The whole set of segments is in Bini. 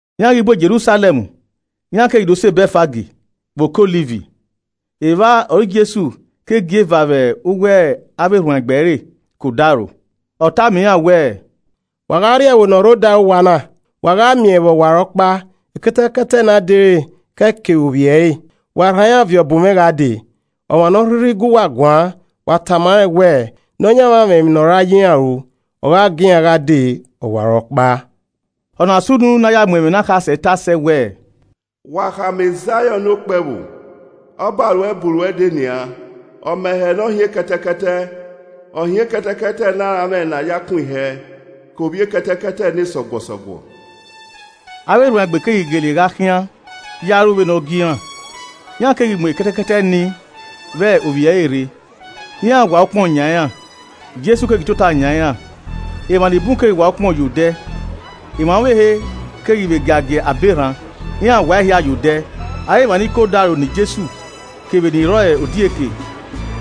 Iran ghi bu Jerusalẹm iran keghi do sẹ Bẹtfag vbe Oke Ọliv. Evba ọre Jesu ke gie eva vbe uwu avbe erhuanegbe ẹre ke odaro. Ọ tama iran wẹẹ, “Wa gha rrie ẹvbo ne ọ rre odaro uwa na. Wa gha miẹn vbe ọwarọkpa ekẹtẹkẹtẹ ne a dere ke ẹe kevbe ovbi ẹre. Wa rhan iran viọ bu mwẹ gha dee. Ọmwa ne ọ rhirhi gu uwa guan, wa tama rẹn wẹ, ‘Nọyaẹnmwa mwẹ emwi ne ọ ra ya iran ru.’ Ọ gha gie iran gha dee ọwarọkpa.” Ọna sunu ne a ya mu ẹmwẹ ne akhasẹ tae sẹ wẹẹ: “Wa khama Zaiọn ne okpẹvbo, ọba ruẹ bu ruẹ dee nian. Ọmẹhẹ ne ọ hin ekẹtẹkẹtẹ, ọ hin ekẹtẹkẹtẹ ne aranmwẹ ne a ya kun ihẹ ke ovbi ekẹtẹkẹtẹ ne sọguọsọguọ.” Avbe erhuanegbe keghi gele gha khian ya ru vbene ọ gie iran. Iran keghi mu ekẹtẹkẹtẹ nii vbe ovbi ẹre rre. Iran wa ukpọn yan iran, Jesu keghi tota yan iran. Emwa ni bun keghi wa ukpọn iran ye odẹ, emwa ọvbehe keghi vbe giagia abọ erhan, iran wa ehia ye odẹ. Avbe emwa ni ke odaro ne Jesu kevbe ni rre ọre odieke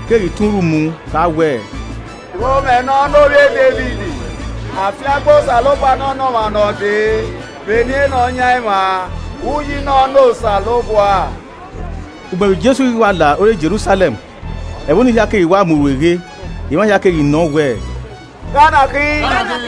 keghi tọn urhu mu kha wẹẹ, “Urhomwẹ nọ ne ovbi e Devid. Afiangbe Osanobua nọ ne ọmwa ne ọ dee vbe eni Nọyaẹnmwa, Uyi nọ ne Osanobua.” Ugbẹn vbe Jesu ghi wa la ore Jerusalẹm, ẹvbo ni hia keghi wa mu rueghe. Emwa hia keghi nọ wẹẹ, “Gha ọ na khin?”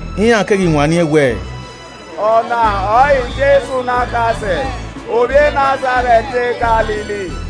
Iran keghi wanniẹn wẹẹ, “Ọ na ọrọre Jesu ne akhase ovbi e Nazarẹt ne Galili.”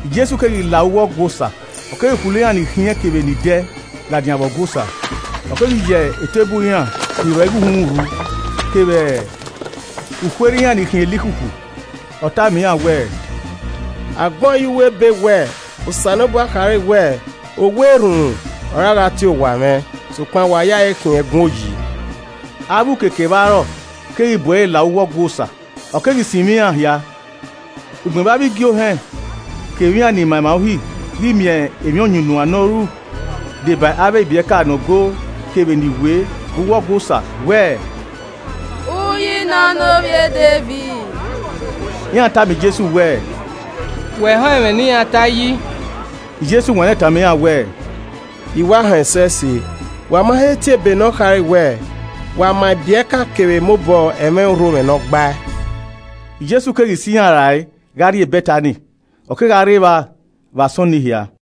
Jesu keghi la uwu Ọgua Osa, ọ keghi khulo iran ni khiẹn kevbe ni dẹ ladian vbe Ọgua Osa. Ọ keghi ya eteburu iran ni rọ igho uhunmwu rhu kevbe ukhuerhe iran ni khiẹn elikhukhu. Ọ tama iran wẹẹ, “A gbẹn ọẹn ye uwu ebe wẹẹ Osanobua khare wẹẹ, ‘Owa erhunmwu ọre a gha tie owa mwẹ?’ Sokpan wa ya ẹe khian ẹgun oyi!” Avbe uke kevbe arọe keghi bu ẹre la uwu Ọgua Osa, ọ keghi sinmwi iran hia. Ugbẹn vbe avbe igiohẹn kevbe iran ni ma emwa Uhi ghi miẹn emwi ọyunnuan ne ọ ru deba avbe ibiẹka nọ go kevbe ni wee vbe uwu Ọgua Osa wẹẹ, “Uyi nọ ne ovbi e Devid.” Iran tama Jesu wẹẹ, “Wẹ họn ẹmwẹ ne iran ta yi?” Jesu wanniẹn tama iran wẹẹ, “I wa họn ẹsẹse. Wa ma he tie ebe ne ọ khare wẹẹ, ‘Wa ma ibiẹka kevbe emobọ ẹmwẹ urhomwẹ ne ọ gbae.’” Jesu keghi sẹ iran rae gha rrie Bẹtani, ọ kegha rre evba vbe asọn nii hia.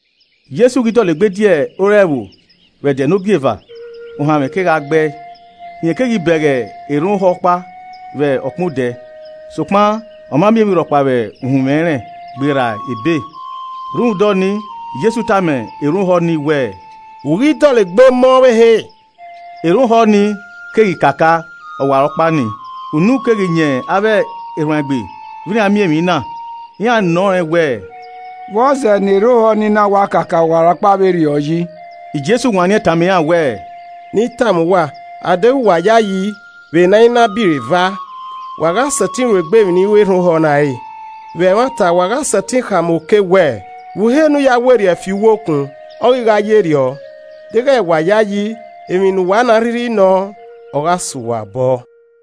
Jesu ghi dọlegbe die ore ẹvbo vbe ẹdẹ ne ogieva, ohanmwẹ kegha gbẹe. Rẹn keghi bẹghe erhan ohọ ọkpa vbe ọkpẹn odẹ. Sokpan ọ ma miẹn emwi rhọkpa vbe uhunmwu ẹnrẹn gberra ebe. Rhunmwuda ọnii Jesu tama erhan ohọ nii wẹẹ, “U i ghi dọlegbe mọ ọvbehe.” Erhan ohọ ni keghi kaka ọwarọkpa nii. Unu keghi yan avbe erhuanegbe vbe iran miẹn emwi na. Iran nọ rẹn wẹẹ, “Vbọzẹ ne erhan ohọ ni na wa kaka ọwarọkpa vberriọ yi?” Jesu wanniẹn tama iran wẹẹ, “Ne I tama uwa, a deghẹ uwa yayi vbe ne a i na biro eva, wa gha sẹtin ru egbe emwi ne I ru erhan ohọ na re, vbe ẹmwata wa gha sẹtin khama oke wẹẹ, ‘Vbọ uhe ne u ya werriẹ fi uwu okun,’ ọ ghi gha ye erriọ. Deghẹ wa yayi, emwi ne uwa rhirhi nọọn, ọ gha sẹ uwa obọ.”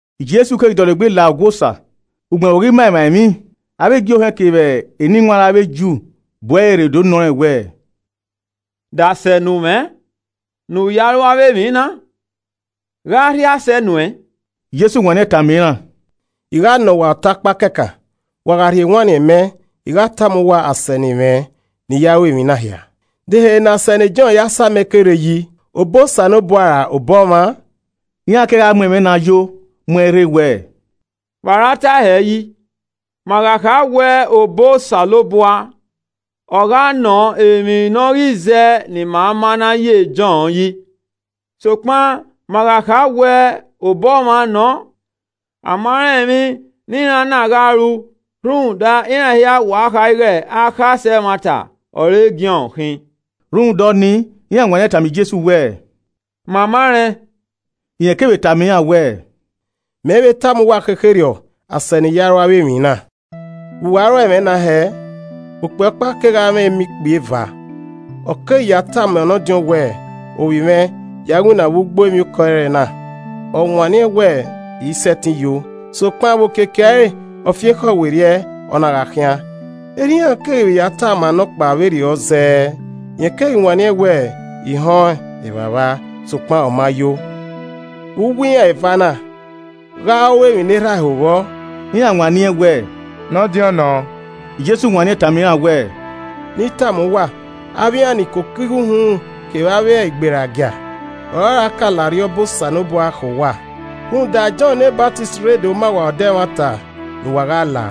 Jesu keghi dọlegbe la Ọgua Osa, ugbẹn vbe ọ ghi ma emwa emwi, avbe igiohẹn kevbe eniwanrẹn avbe Ju bu ẹre rre do nọ rẹn wẹẹ, “De asẹ ne u mwẹ ne u ya ru avbe emwi na, gha ọ rhie asẹ nu uẹn?” Jesu wanniẹn tama iran, “I gha nọ uwa ọta ọkpa kẹkan wa gha rhie ewanniẹn mẹ, I gha tama uwa asẹ ne I mwẹ ne I ya ru emwi na hia. De ehe ne asẹ ne Jọn ya samẹ ke rre yi? Obọ Osanobua ra obọ ọmwa?” Iran kegha mu ẹmwẹ na yo mu uẹn rre wẹẹ, “Vbe a ra tae hẹ yi? Ma gha kha wẹẹ obọ Osanobua, ọ gha nọ emwi ne ọ ghi zẹ ne ima ma na ya e Jọn yi. Sokpan ma gha kha wẹẹ obọ ọmwa nọ, a ma rẹn emwi ne iran na gha ru rhunmwuda iran hia wa kha ighẹ akhasẹ ẹmwata ọre Jọn khin.” Rhunmwuda ọnii, iran wanniẹn tama Jesu wẹẹ, “Ma ma rẹn.” Rẹn kevbe tama iran wẹẹ, “Mẹ i vbe tama uwa khekherriọ asẹ ne I ya ru avbe emwi na. “Vbe uwa a ro ẹmwẹ na hẹ? Okpia ọkpa kegha mwẹ emọ ikpia eva. Ọ keghi ya tama nọdiọn wẹẹ, ‘Ovbi mwẹ, ya winna vbe, ugbo emwiokọ ẹrẹna.’ Ọ wanniẹn wẹẹ, ‘I i sẹtin yo.’ Sokpan, vbe okiekie ẹre, ọ fi ekhọe werriẹ, ọ na gha khian. Erha iran keghi vbe ya tama nọkpa vberriọ zẹẹ. Rẹn keghi wanniẹn wẹẹ, ‘I họn ẹn evbavba.’ Sokpan ọ ma yo. Vbe uwu iran eva na, gha ọ ru emwi ne erha ẹe ho vbọ?” Iran wanniẹn wẹẹ, “Nọdiọn nọ.” Jesu wanniẹn tama iran wẹẹ, “Ne I tama uwa, avbe iran ni koko igho uhunmwu kevbe avbe igberagia ọre ọra ka la arriọba Osanobua khẹ uwa. Rhunmwuda, Jọn ne Ọsamẹ rre do ma uwa odẹ ẹmwata ne uwa gha la,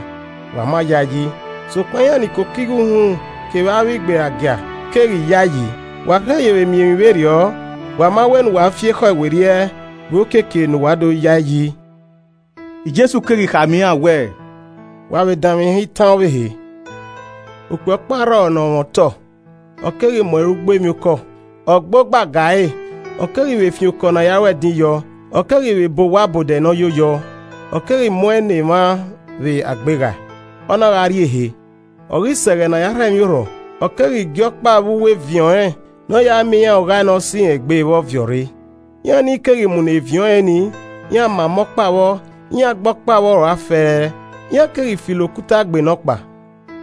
wa ma ya ẹe yi. Sokpan, iran ni koko igho uhunmwu kevbe avbe igberagie keghi ya ẹe yi. Wa rhe yevbe miẹn emwi vberriọ, wa ma wẹ ne uwa fi ekhọe werriẹ vbe okiekie ne uwa do ya ẹe yi.” Jesu keghi khama iran wẹẹ, “Wa vbe danmwehọ itan ọvbehe: okpia ọkpa rrọọ ne ọ mwẹ otọ, ọ keghi mu ẹre ugbo emwiokọ, ọ gba ogba ga ẹre, ọ keghi vbe fian okọ ne a na ru ẹdin yọọ, ọ keghi vbe bọọ owa ọbodẹ ne ọ yo yọọ, ọ keghi mu uẹn ne emwa vbe agbeghae, ọ na gha rrie ehe. Ọ ghi sẹ ẹghẹ ne a ya rhọ emwiorhọ, ọ keghi gie ọkpa vbe uwu eviẹn ọnrẹn ne ọ ya miẹn iran oghae ne ọse irẹn egbe vbọ viọ rre. Iran ni keghi munọ eviẹn ọnrẹn nii, iran mama ọkpa vbọ, iran gbe ọkpa vbọ rua fẹẹrẹ, iran keghi filo okuta gbe nọkpa.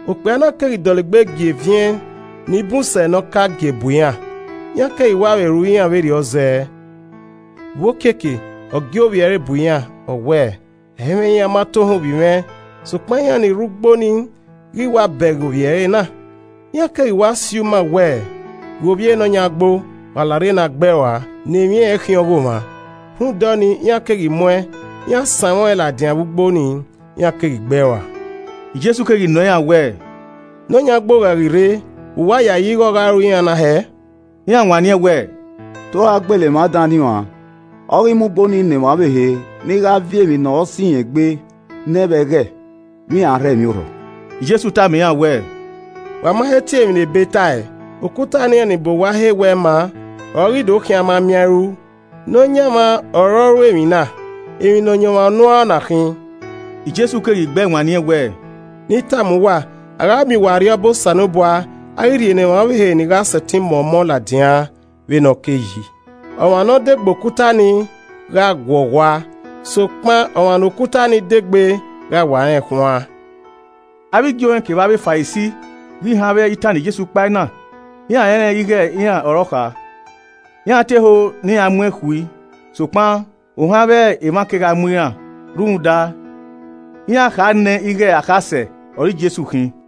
Okpia na keghi dọlegbe gie eviẹn ni bun sẹ ne ọ ka gie bu iran. Iran keghi wa vbe ru iran vberriọ zẹẹ. Vbe okiekie, ọ gie ovbi ẹre bu iran, ọ wẹẹ, ‘Ẹ i mwẹ iran ma tohan ovbi mwẹ.’ Sokpan iran ni rre ugbo nii ghi wa bẹghe ovbi ẹre na, iran keghi wa si uma wẹẹ, ‘Ghe ovbi enọyan ugbo, wa larre ne a gbe ẹe rua ne emwi ẹnrẹn khian ọghọmwa.’ Rhunmwuda ọnii, iran keghi mu uẹn, iran sanmwẹ ọẹn ladian vbe ugbo ni, iran keghi gbe ẹe rua.” Jesu keghi nọọn iran wẹẹ, “Nọyan ugbo gha ghi rre, vbe uwa yayi ighẹ ọ gha ru iran na hẹẹ?” Iran wanniẹn wẹẹ, “Te ọ ra gbele emwa dan ni uan, ọ ghi mu ugbo ni ne emwa ọvbehe ni gha viọ emwi ne ọ sẹ irẹn egbe ne ẹn vbe ẹghẹ, vbe iran a rhọ emwiorhọ.” Jesu tama iran wẹẹ, “Wa ma he tie emwi ne Ebe tae? “ ‘Okuta ne iran ni bọ owa he wẹ ẹ i ma ọre ọ ghi do khian a ma miẹn a i ru. Nọyaẹnmwa ọre ọ ru emwi na, emwi ne ọ yan ọmwa unu uan ọ na khin.’” Jesu keghi gbẹe wanniẹn wẹẹ, “Ne I tama uwa, a gha miẹn uwa Arriọba Osanobua, a ghi rhie ne emwa ọvbehe ni gha sẹtin mọ ọmọ ladian vbe ne ọ kei yi. [ Ọmwa ne ọ de gbe okuta ni, gha guọghọ ua. Sokpan ọmwa ne okuta ni de gbe gha wa rẹnkhuan.]” Avbe igiohẹn kevbe avbe Farisi ghi họn avbe itan ne Jesu kpae na, iran rẹnrẹn ighe iran ọre ọ kha. Iran te ho ne iran mu ẹn khui, sokpan ohan avbe emwa kegha mu iran rhunmwuda iran kha nẹ ighe akhasẹ ọre Jesu khin.